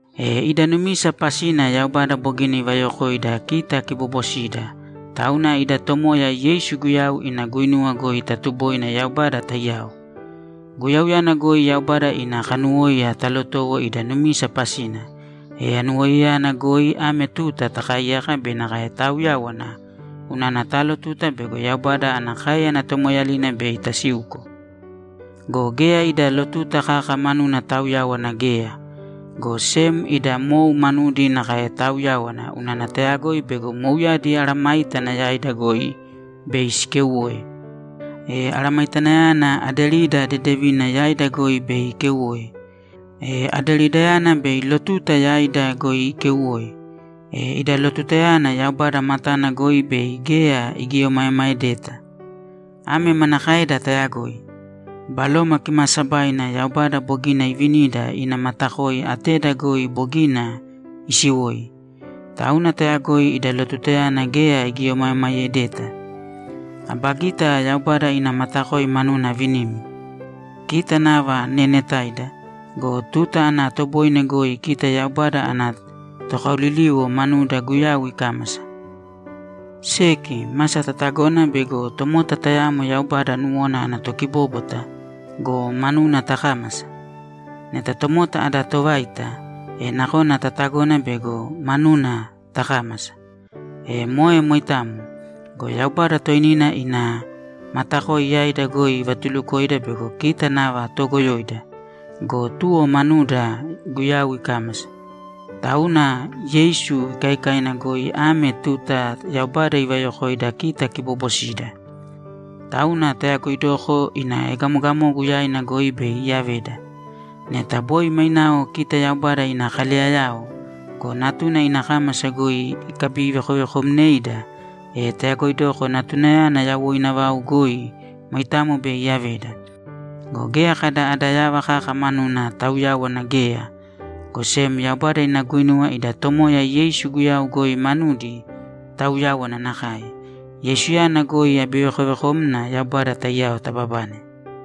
E ida numisa pasina Yaubada bogina ivayokoida kita kiboobosida, tauna ida Tomoya Yeisu Guyau ina guinuwa goi tatuboina Yaubada taiyao. Guyauyana goi Yaubada ina kanuwóiya talotowo ida numisa pasina, e anuwoiyayana goi ame tuta takaaiyaka be nakae taauyáwana unana taalotuta bego Yaubada ana káeyana tomoeeyalina bei tasiuko. Go geya ida lotuta kaka manuna taauyáwana geya, go sem ida mou manudi nakae taauyáwana unana tayagoi bego mouyadi mesayágana yaida goi bei sikeuwoe. E aramaitanayana aderida dedevina yaida goi bei ikeuwoe. E aderidayana bei lotuta yaida goi ikeuwoe. E ida lotutayana Yaubada matana goi bei geya igieomaemaedeta. Ame manakaeda tayagoi? Baloma Kimaasabaina Yaubada bogina iivinida ina matakoi ateda goi bogina isiwoi. Tauna tayagoi ida lotutayana geya igieomaemaedeta. Aba gita Yaubada ina matakoi manuna avinimi. Kita nava neenetaida go, tuta ana toboine goi kita Yaubada ana tokaoliliwo manuda Guyau ikámasa. Seki, masa tatagona bego tomota tayamo Yaubada nuwona ana tokibóbwata go, manuna takámasa. Neta tomota ada tovaita, e nakona tatagona bego manuna takámasa. E moe moitamo go, Yaubada toinina ina matakoi yaida goi ivatulukoida bego kita nava toogoyoida go, tuwo manuda Guyau ikámasa. Tauna Yeisu ikaikaina goi ame tuta Yaubada ivayokoida kita kiboobosida. Tauna tayagoidoko ina egamogamogu yaina goi bei iyaveda. Neta boi mainao kita Yaubada ina kaleyayao go, Natuna ina kámasa goi ikabivekovekomneida, e tayagoidoko Natunayana yawoina vau goi moitamo bei iyaveda. Go geya kada ada yava kaka manuna taauyáwana geya, go sem Yaubada ina guinuwa ida Tomoya Yeisu Guyau goi manudi tauyáwana nakae. Yeisuyana goi abivekovekomna Yaubada taiyao tababane.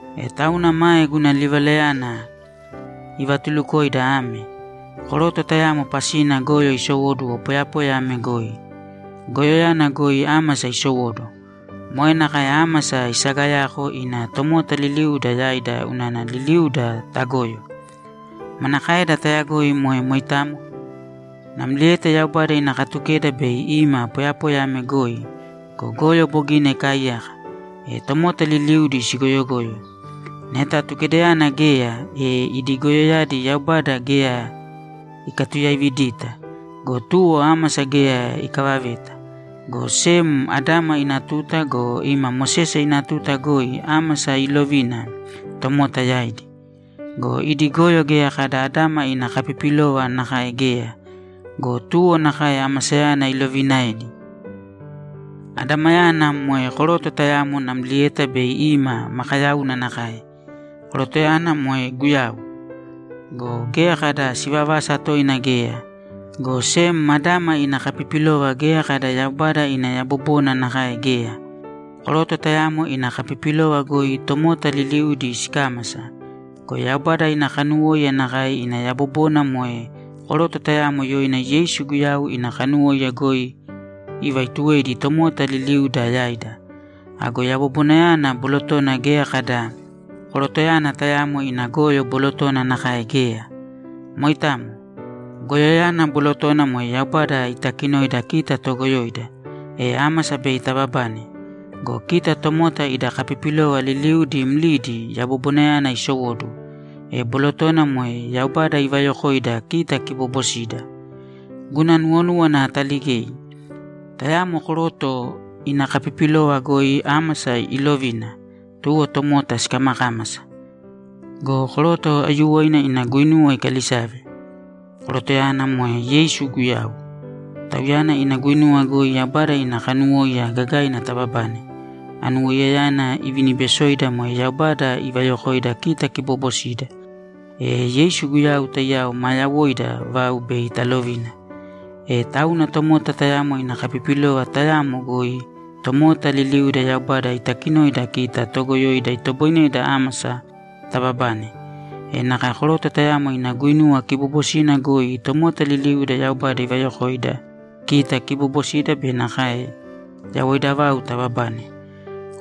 E tauna mae guna livalayana ivatulukoida ame: Koroto tayamo pasina goyo isowóduwo poyapoya ame goi. Goyoyana goi ámasa isowóduwo. Moe nakae ámasa isagayako ina tomota liliuda yaida unana liliuda tagoyo. Manakaeda tayagoi moe moitamo? Namlieta Yaubada ina Katukeda bei ima poyapoya ame goi go, goyo bogina ikaaiyaka, e tomota liliudi sigoyogoyo. Neta Atukedayana geya, e idi goyoyadi Yaubada geya ikatuyaividita go, tuwo ámasa geya ikavaveta, go sem Adama ina tuta go, ima Mosese ina tuta goi ámasa iilovina tomota yaidi. Go idi goyo geya kada Adama ina kapipilova nakae geya go, tuwo nakae amasayana iloviinaedi. Adamayana moe koroto tayamo namlieta bei ima makayauna nakae, korotoyana moe Guyau. Go geya kada sivavasa toina geya, go sem Adama ina kapipilova geya kada Yaubada ina yabobona nakae geya. Koroto tayamo ina kapipilova goi tomota liliudi sikámasa go, Yaubada ina kanuwóiya nakae ina yabobona moe koroto tayamo yoina Yeisu Guyau ina kanuwóiya goi ivaituwedi tomota liliuda yaida. Ago yabobonayana bolotona geya kada korotoyana tayamo ina goyo bolotona nakae geya. Moitamo. Goyoyana bolotona moe Yaubada itakinoida kita toogoyoida, e ámasa bei tababane. Go kita tomota ida kapipilova liliudi mlidi yabobonayana isowóduwo, e bolotona moe Yaubada ivayokoida kita kiboobosida. Guna nuwonúwana ataligei. Tayamo koroto ina kapipilova goi ámasa iilovina, tuwo tomota sikamakámasa. Go koroto aiyuwoina ina guinuwa ikalisave. Korotoyana moe Yeisu Guyau. Tauyana ina guinuwa goi Yaubada ina kanuwóiya gagaina taababane. Anuwoiyayana ivinibesoida moe Yaubada ivayokoida kita kiboobosida. E Yeisu Guyau taiyao maa yawoida vau bei talovina. E tauna tomota tayamo ina kapipilova tayamo goi tomota liliuda Yaubada itakinoida kita toogoyoida itoboineda ámasa tababane. E nakae koroto tayamo ina guinuwa kiboobosina goi tomota liliuda Yaubada ivayokoida kita kiboobosida be nakae yawoida vau tababane.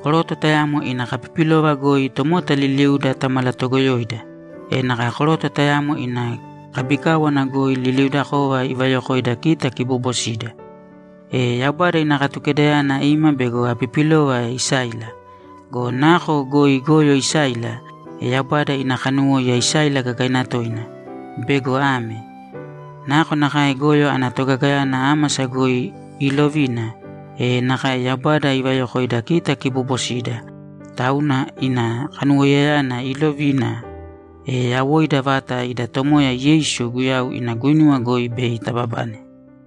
Koroto tayamo ina kapipilova goi tomota liliuda tamalatogoyoida, e nakae koroto tayamo ina kabikáwana goi liliudakova ivayokoida kita kiboobosida. E Yaubada ina Katukedayana ima bego apipilova isáila. Go nako goi goyo isáila, e Yaubada ina kanuwóiya isáila gagaina toina bego ame: Nakonakae goyo ana togagayana ámasa goi iilovina, e nakae Yaubada ivayokoida kita kiboobosida, tauna ina kanuwoiyayana iilovina, e yawoida vata ida Tomoya Yeisu Guyau ina guinuwa goi bei tababane.